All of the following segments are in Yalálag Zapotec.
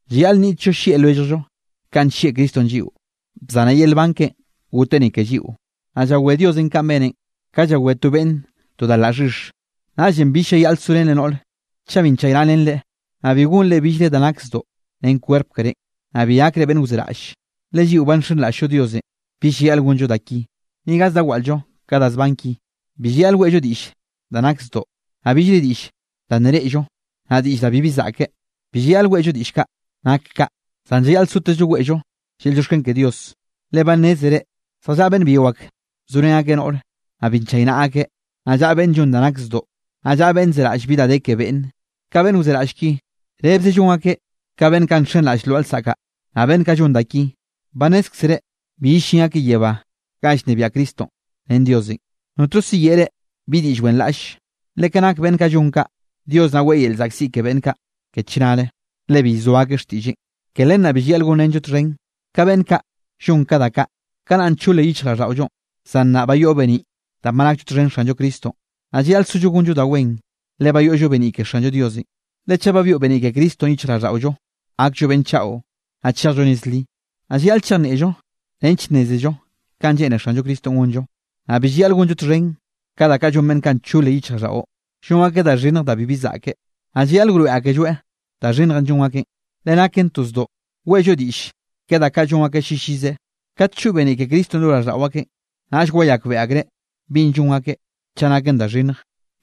Llayaꞌl nniꞌtllo llieꞌ lwelljllo kanꞌ nllieꞌ Cristonꞌ lliꞌo, bzaneꞌ yel nban keꞌe goteꞌ ni ke lliꞌo. Naꞌ llawé Diosenꞌ kanꞌ beneꞌn, ka llawé to beꞌnne to da laꞌ xhix. Naꞌllenꞌ bill llayaꞌl sorenre noꞌr chaꞌ bi nchaynaꞌrenreꞌ, naꞌ bi gonre billre da nak zdoꞌ ren kwerp kerénꞌ, naꞌ bi gakre beꞌnn wzeraꞌll. Le lliꞌo ba nxenraꞌll-llo Diosenꞌ, bill llayaꞌl gonllo da ki, ni gaz da waꞌl-llo ka da zban ki. Bi llayaꞌl weꞌllo diꞌll da nak zdoꞌ, naꞌ billre diꞌll da nne reꞌllo, naꞌ diꞌll da bibi zaꞌke, bi llayaꞌl weꞌllo diꞌll kaꞌ nak kaꞌ. Zan llayaꞌl sotezllo weꞌllo yel llioxken ke Dios. Le ba nnézere zjallaꞌa beꞌnn byio ak zorén akeꞌ noꞌr, naꞌ bi nchaynaꞌa akeꞌ, naꞌ llaꞌa beꞌnn llon da nak zdoꞌ, naꞌ llaꞌa beꞌnn zeraꞌll bi da de ke beꞌnne. (Ka beꞌnn wzeraꞌll ki, rebze llon akeꞌ ka beꞌnn kaꞌ nxenraꞌll lwaꞌa lsaꞌk kaꞌ.) Naꞌ beꞌnn kaꞌ llon da ki, ba nnézkzere bi yellín akeꞌ yebá ganꞌ llnebiaꞌ Cristonꞌ ren Diosenꞌ. Notno siyeꞌe reꞌ bi diꞌll wenraꞌlle. Le ka nak beꞌnn kaꞌ llon kaꞌ, Dios naꞌ weꞌe yel llzaꞌkziꞌ ke beꞌnn kaꞌ ke chnare, le bi llzoa akeꞌ xtiꞌlleꞌn. Ke len naꞌ bi llayaꞌl gonrenllo txhen ka beꞌnn kaꞌ llon ka da kaꞌ. Kanaꞌ nna nchol yichjraꞌlldaꞌollo, zan nnaꞌ ba yoꞌllo beniꞌ danꞌ ba nakllo txhen Xanllo Cristonꞌ, naꞌ llayaꞌl sollo gonllo da wen, le ba yoꞌllo beniꞌ ke Xallo Diosenꞌ. Le Chaꞌ ba byoꞌ beniꞌ ke Cristonꞌ yichjraꞌlldaꞌollo, gakllo beꞌnn chaꞌo, naꞌ chejllo nez li. Naꞌ llayaꞌl chejnieꞌllo nench nnézello kanꞌ lleꞌne Xanllo Cristonꞌ gonllo. Naꞌ bi llayaꞌl gonllo txhen ka da kaꞌ llon beꞌnn kaꞌ nchole yichjraꞌlldaꞌo, llon akeꞌ da xhinnj da bibi zaꞌke. Naꞌ llayaꞌl wroeꞌ akelloeꞌ da xhinnjenꞌ llon akeꞌn. Le naken to zdoꞌ weꞌllo diꞌll ke da kaꞌ llon akeꞌ llillize. Kat choꞌ beniꞌ ke Cristonꞌ lo raꞌlldaꞌo akeꞌn, naꞌll wayakbeꞌe akreꞌ binꞌ llon akeꞌ chaꞌ naken da xhinnj,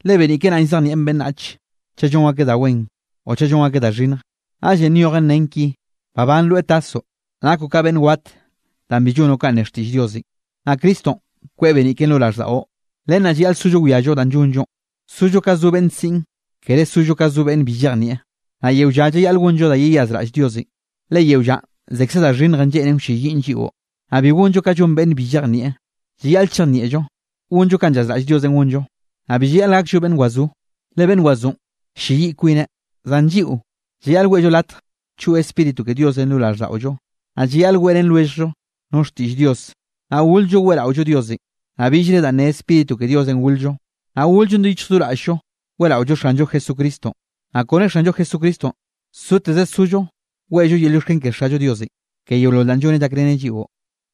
le beniꞌ keꞌe naꞌn llzejnieꞌn beꞌnnach chaꞌ llon akeꞌ da wen o chaꞌ llon akeꞌ da xhinnj. Naꞌllenꞌ nyojen nen ki: Babán, rweꞌ tasoꞌ, nakoꞌ ka beꞌnn wat danꞌ bi llonoꞌ kanꞌ ne xtiꞌll Diosenꞌ. Naꞌ Cristonꞌ kweꞌ beniꞌ keꞌen lo raꞌlldaꞌo. Len naꞌ llayaꞌl sollo wiallo danꞌ llonllonꞌ. Sollo ka zo beꞌnn siꞌn, kere sollo ka zo beꞌnn bi llejnieꞌ. Naꞌ yeo lla llayaꞌl gonllo da yeyazraꞌll Diosenꞌ, le yeo llanꞌ zekze da xhinnjenꞌ lleꞌnen wlleyiꞌn lliꞌo. Naꞌ bi gonllo ka llon beꞌnn bi llejnieꞌ. Llayaꞌl chejnieꞌllo gonllo kanꞌ llazraꞌll Diosenꞌ gonllo. Naꞌ bi llayaꞌl gakllo beꞌnn wazó, le beꞌnn gwazónꞌ ll-lleyiꞌ kwineꞌ. Zan lliꞌo llayaꞌl weꞌllo latj choꞌ Spíritu ke Diosenꞌ lo raꞌlldaꞌollo. Naꞌ llayaꞌl weꞌrén lwelljllo no xtiꞌll Dios, naꞌ gol-llo weꞌraollo Diosenꞌ, naꞌ billre da ne Spíritu ke Diosenꞌ gol-llo. Naꞌ gol-llon do yichj do raꞌll-llo weꞌraollo Xanllo Jesucristonꞌ. Naꞌ kone Xanllo Jesucristonꞌ soteze sollo weꞌllo yel llioxken ke Xallo Diosenꞌ, ke yeolol danꞌ llonneꞌ llakreneꞌ lliꞌo.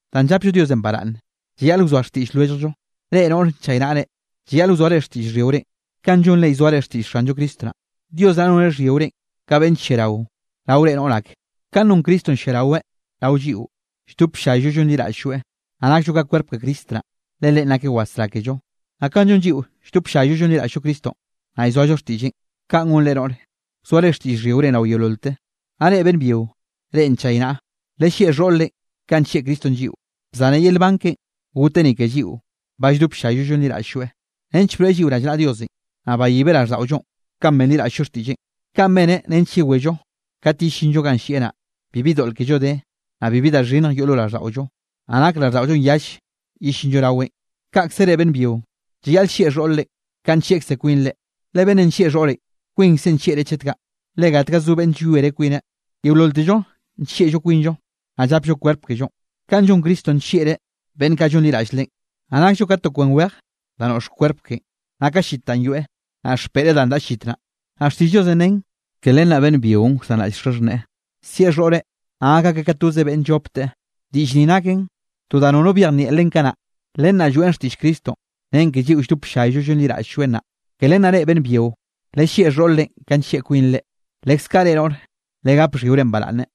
Danꞌ llapllo Diosenꞌ baraꞌnne, llayaꞌl wzoa xtiꞌll lwelljllo. Reꞌ noꞌre, nchaynaꞌre, llayaꞌl wzoare xtiꞌll xhyiorenꞌ kanꞌ llonre llzoare xtiꞌll Xanllo Cristo naꞌ. Dios naꞌ noneꞌ xhyiorenꞌ ka beꞌnn lliarao rao reꞌ noꞌr ak, kanꞌ non Cristonꞌ lliaraweꞌ rao lliꞌo, lldop ll-llayllo llonliraꞌll-lloeꞌ. Naꞌ nakllo ka kwerp ke Cristo naꞌ, le Leꞌen nakeꞌ wasrá kello. Naꞌ kanꞌ llon lliꞌo lldop ll-llay llonliraꞌll-llo Cristonꞌ, naꞌ llzoallo xtiꞌlleꞌn, kaꞌn gon reꞌ noꞌre, wzoare xtiꞌll xhyiorenꞌ rao yeololte. Naꞌ reꞌ beꞌnn byio, reꞌ nchaynaꞌa, lellieꞌ xhoꞌr-renꞌ kanꞌ nllieꞌ Cristonꞌ lliꞌo, bzaneꞌ yel nban keꞌen goteꞌ ni ke lliꞌo ba lldop ll-llayllo llonliraꞌll-lloeꞌ, nench broeꞌ lliꞌo rallnaꞌa Diosenꞌ, naꞌ bayibeꞌ raꞌlldaꞌollonꞌ kanꞌ benliraꞌll-llo xtiꞌlleꞌn. Kaꞌn beneꞌ nench yewello kat yellinllo ganꞌ llieꞌ naꞌ, bibi doꞌl kello de, naꞌ bibi da xhinnj yoꞌ lo raꞌlldaꞌollo, naꞌ nak raꞌlldaꞌollonꞌ yall yellinllo raweꞌn. Kaꞌkze reꞌ beꞌnn byio, llayaꞌl llieꞌ xhoꞌr-re kanꞌ nllieꞌkze kwinre, le beꞌnnenꞌ nllieꞌ xhoꞌreꞌ, kwinkzeꞌ nllieꞌre chet kaꞌ. Le gatga zo beꞌnn llwiere kwineꞌ, yeololtello nllieꞌllo kwinllo, naꞌ llapllo kwerp kellonꞌ. Kanꞌ llon Cristonꞌ nllieꞌreꞌ beꞌnn kaꞌ llonliraꞌll Leꞌen. Naꞌ nakllo ka to kwen wej da noꞌx kwerp keꞌen, naꞌ ka llit danꞌ yoeꞌ, naꞌ xpeꞌreꞌ danꞌ daꞌa llit naꞌ. Naꞌ xtiꞌll Diosenꞌ nen: “Ke len naꞌ beꞌnn byionꞌ wsanraꞌll xaxhneꞌe, sieꞌ xhoꞌreꞌ, naꞌ gak akeꞌ ka toze beꞌnne llopteꞌ.” Diꞌll ni naken to da nono byejnieꞌ len kanaꞌ. Len naꞌ lloeꞌn xtiꞌll Cristonꞌ, ren ke lliꞌo lldop ll-llayllo llonliraꞌll-lloeꞌ naꞌ. Ke len naꞌ reꞌ beꞌnn byio, lellieꞌ xhoꞌr-renꞌ ka nllieꞌ kwinre, leskaꞌ reꞌ noꞌre, legap xhyiore baraꞌnne.